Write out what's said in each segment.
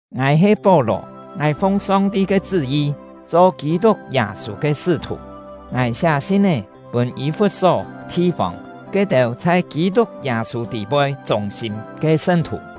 Ngài he Pó-lò; ngài fung Song-ti ke chṳ́-yi cho Kî-tuk Yâ-sû ke sṳ́-thù. Ngài siá sin-é pûn Yî-fut-só thi-fông Yû-têu kú-kién mò “Yî-fut-só thi-fông”. ke-têu chhai Kî-tuk Yâ-sû tî-poi chûng-sîm ke sṳn-thù: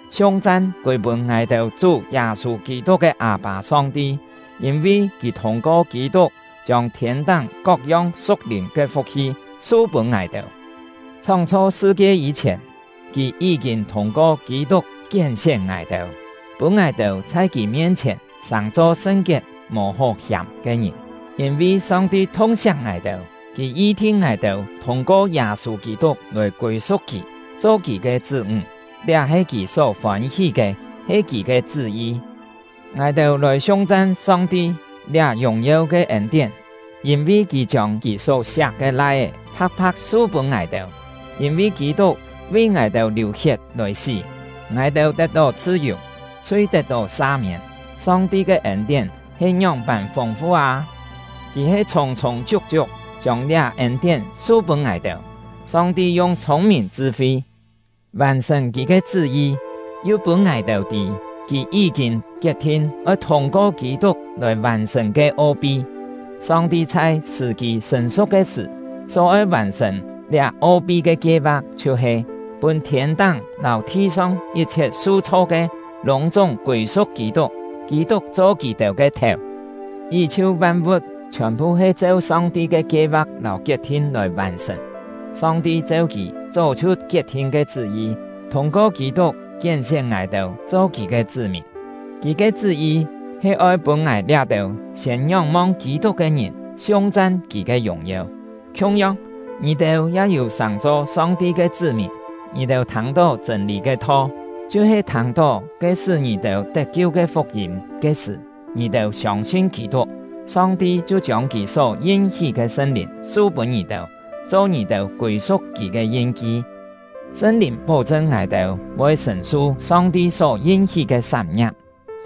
Siung-chan kûi-pûn ngài-têu Chú Yâ-sû Kî-tuk ke Â-pâ Song-ti! Yîn-vi Kì thûng-ko Kî-tuk chiông thiên-táng kok-yong su̍k-lìn ke fuk-hi su-pûn ngài-têu. Chhóng-chho sṳ-kie yî-chhièn, Kì yí-kîn thûng-ko Kî-tuk kién-sién ngài-têu, pûn ngài-têu chhai Kì mien-chhièn sàng-cho sṳn-kiet, mò hó hiàm ke ngìn. Yîn-vi Song-ti thung-siak ngài-têu, Kì yi-thin ngài-têu thûng-ko Yâ-sû Kî-tuk lòi kûi-su̍k Kì, cho Kì ke chṳ́-ńg; liá he Kì só fôn-hí ke, he Kì ke chṳ́-yi. Ngài-têu lòi siung-chan Song-ti liá yùng-yeu ke ên-tién, yîn-vi Kì chiông Kì só-siak ke Lai-é pha̍k-pha̍k su-pûn ngài-têu! Yîn-vi Kî-tuk vi ngài-têu liù-hiet lòi sí, ngài-têu tet-tó chhṳ-yù, chhui tet-tó sa-miên. Song-ti ke ên-tién he ngióng-pân fûng-fu â! Kì he chhûng-chhûng chiuk-chiuk chiông liá ên-tién su-pûn ngài-têu! Song-ti yung chhûng-mìn chṳ-fi vàn-sṳ̀n Kì ke chṳ́-yi, yu pûn ngài-têu tî Kì yí-kîn kiet-thin oi thûng-ko Kî-tuk lòi vàn-sṳ̀n ke o-pi. Song-ti chhai sṳ̀-kî sṳ̀n-su̍k ke sṳ̀, só oi vàn-sṳ̀n liá o-pi ke kie-va̍k chhiu-he: Pûn thiên-táng lâu thi-song yit-chhiet su-chho ke lûng-chúng kûi-su̍k Kî-tuk, Kî-tuk cho kì-têu ke thèu. Yí-chhiu van-vu̍t chhiòn-phu he cheu Song-ti ke kie-va̍k lâu kiet-thin lòi vàn-sṳ̀n. Song-ti cheu Kì chó chhiu kiet-thin ke chṳ́-yi, thûng-ko Kî-tuk kién-sién ngài-têu cho Kì ke chṳ́-mìn. Kì ke chṳ́-yi he oi pûn ngài liá-têu siên ngióng-mong Kî-tuk ke ngìn siung-chan Kì ke yùng-yeu! Khiung-yong, ngì-têu ya yû sàng-cho Song-ti ke chṳ́-mìn. Ngì-têu thâng-tó chṳ̂n-lî ke tho, chhiu-he thâng-tó ke sṳ́ ngì-têu tet-kiu ke fuk-yîm ke sṳ̀, ngì-têu siông-sin Kî-tuk, Song-ti chhiu chiông Kì só yin-hí ke Sṳn-Lìn su-pûn ngì-têu, cho ngì-têu kûi-su̍k Kì ke yin-ki. Sṳn-Lìn pó-chṳn ngài-têu voi sṳ̀n-su Song-ti só yin-hí ke sán-ngia̍p,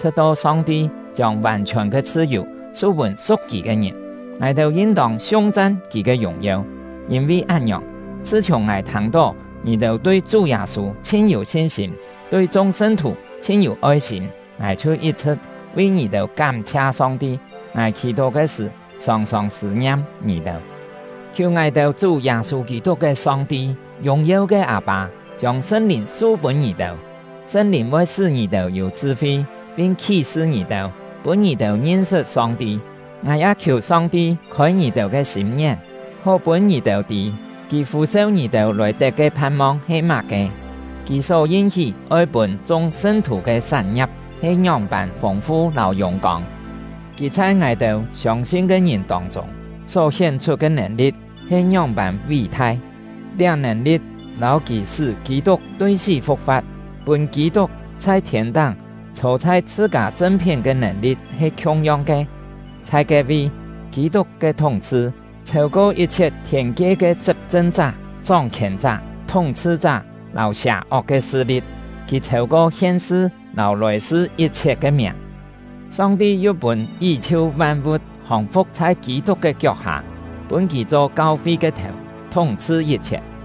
chhṳ̍t-to Song-ti chiông vàn-chhiòn ke chhṳ-yù su-pûn su̍k Kì ke ngìn. Ngài-têu yin-tông siung-chan Kì ke yùng-yeu! Yîn-vi án-ngiòng, chhṳ-chhiùng ngài thâng-tó ngì-têu tui Chú Yâ-sû chhin yû sin-sîm, tui chung sṳn-thù chhin yû oi-sîm, ngài chhiu yit-chhṳ̍t vi ngì-têu kám-chhia Song-ti. Ngài khì-tó ke sṳ̀ sòng-sòng sṳ̂-ngiam ngì-têu, khiù ngài-têu Chú Yâ-sû Kî-tuk ke Song-ti, yùng-yeu ke Â-pâ, chiông Sṳn-Lìn su-pûn ngì-têu. Sṳn-Lìn voi sṳ́ ngì-têu yû chṳ-fi, pin khí-sṳ ngì-têu, pûn ngì-têu ngin-sṳt Song-ti. Ngài ya khiù Song-ti khôi ngì-têu ke sîm-ngién, hó pûn ngì-têu tî: Kì fû-seu ngì-têu lòi tet ke phan-mong he má-ke; Kì só yin-hí oi pûn chung sṳn-thù ke sán-ngia̍p he ngióng-pân fûng-fu lâu yùng-kông; Kì chhai ngài-têu siông-sin ke ngìn tông-chûng só hién-chhut ke nèn-li̍t he ngióng-pân ví-thai. Liá nèn-li̍t lâu Kì sṳ́ Kî-tuk tui sí fu̍k-fa̍t, pûn Kî-tuk chhai thiên-táng chhô chhai chhṳ-kâ chṳn-phién ke nèn-li̍t he khiung-yong ke. Chhai ke-vi, Kî-tuk ke thúng-chhṳ chhêu-ko yit-chhiet thiên-kie ke chṳp-chṳn-chá, chóng-khièn-chá, thúng-chhṳ-chá, lâu sià-ok ke sṳ-li̍t; kì chhêu-ko hien-sṳ lâu lòi-sṳ yit-chhiet ke miàng. Song-ti yu pûn yí-chhiu van-vu̍t hòng-fu̍k chhai Kî-tuk ke kiok-hâ, pûn kì cho kau-fi ke thèu, thúng-chhṳ yit-chhiet.